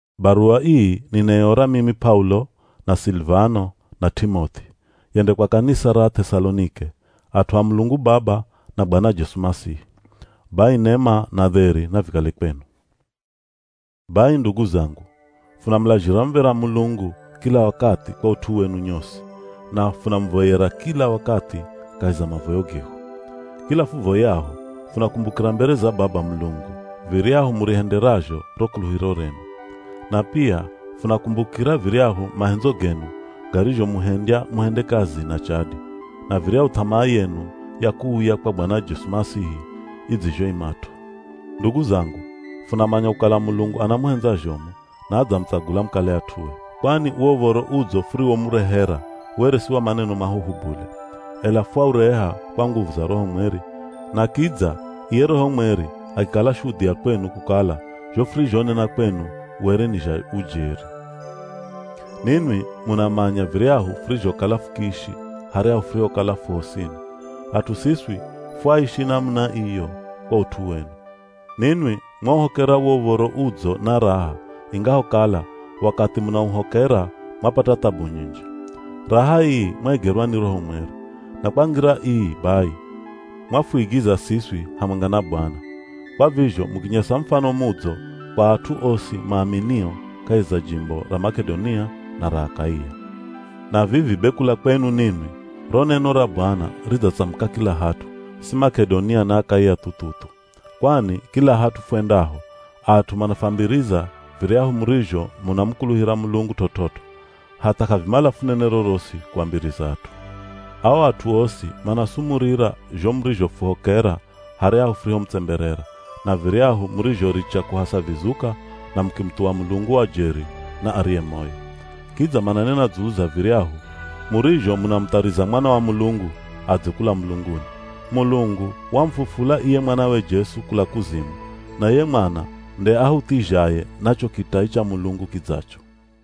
Baruwa ii ninaiora mimi P'aulo, na Silivano, na T'imoth'i, yende kwa kanisa ra Ath'esalonike, at'u a Mulungu Baba na Bwana Jesu Masihi. Bai nema na dheri navikale kwenu. Bai ndugu zangu, funamulazhira muv̱era Mulungu kila wakathi kwa ut'u wenu nyosi, na funamuvoyera kila wakathi kahi za mavoyo gehu. Kila fuvoyaho funakumbukira mbere za Baba Mulungu viryahu murihenderazho ro kuluhiro renu. Na pia funakumbukira viryahu mahendzo genu garizhomuhendya muhende kazi na chadi, na viryahu th'amaa yenu ya kuuya kwa Bwana Jesu Masihi idzizhoimat'o. Ndugu zangu funamanya kukala Mulungu anamuhendza zhomu na adzamutsagula mukale at'ue. Kwani wo Uv̱oro Udzo furiwomurehera were si wa maneno mahuhu bule, ela fwaureha kwa nguvu za Roho Mweri, na kidza iye Roho Mweri akikala shudhia kwenu kukala zho furizhonena kwenu were ni zha ujeri. Ninwi munamanya viryahu furizhokala fukiishi haryahu furihokala fu hosini. At'u siswi fwaishi namuna iyo kwa ut'u wenu. Ninwi mwauhokera wo Uv̱oro Udzo na raha ingahokala, wakathi munauhokera mwapata thabu nyinji. Raha ii mwaigerwa ni Roho Mweri. Na kwa ngira ii bai mwafuigiza siswi hamwenga na Bwana. Kwa vizho mukinyesa mufano mudzo kwa at'u osi maaminio kahi za jimbo ra Mak'edonia na ra Akaia. Na vivi be kula kwenu ninwi ro neno ra Bwana ridzatsamuka kila hat'u, si Mak'edonia na Akaia thu-thu-thu. Kwani kila hat'u fwendaho at'u manafwambiriza viryahu murizho munamukuluhira Mulungu t'ot'ot'o. Hatha k'avimala funene rorosi kuambiriza at'u. Ao at'u osi manasumurira zho murizhofuhokera, haryahu furihomutsemberera, na viryahu murizhoricha kuhasa vizuka na mukimuthuwa Mulungu wa jeri na ariye moyo. Kidza mananena dzulu za viryahu murizho munamuthariza Mwana wa Mulungu adze kula mulunguni. Mulungu wamufufula iye mwanawe Jesu kula kuzimu na iye Mwana nde ahuthizhaye na cho kitai cha Mulungu kidzacho.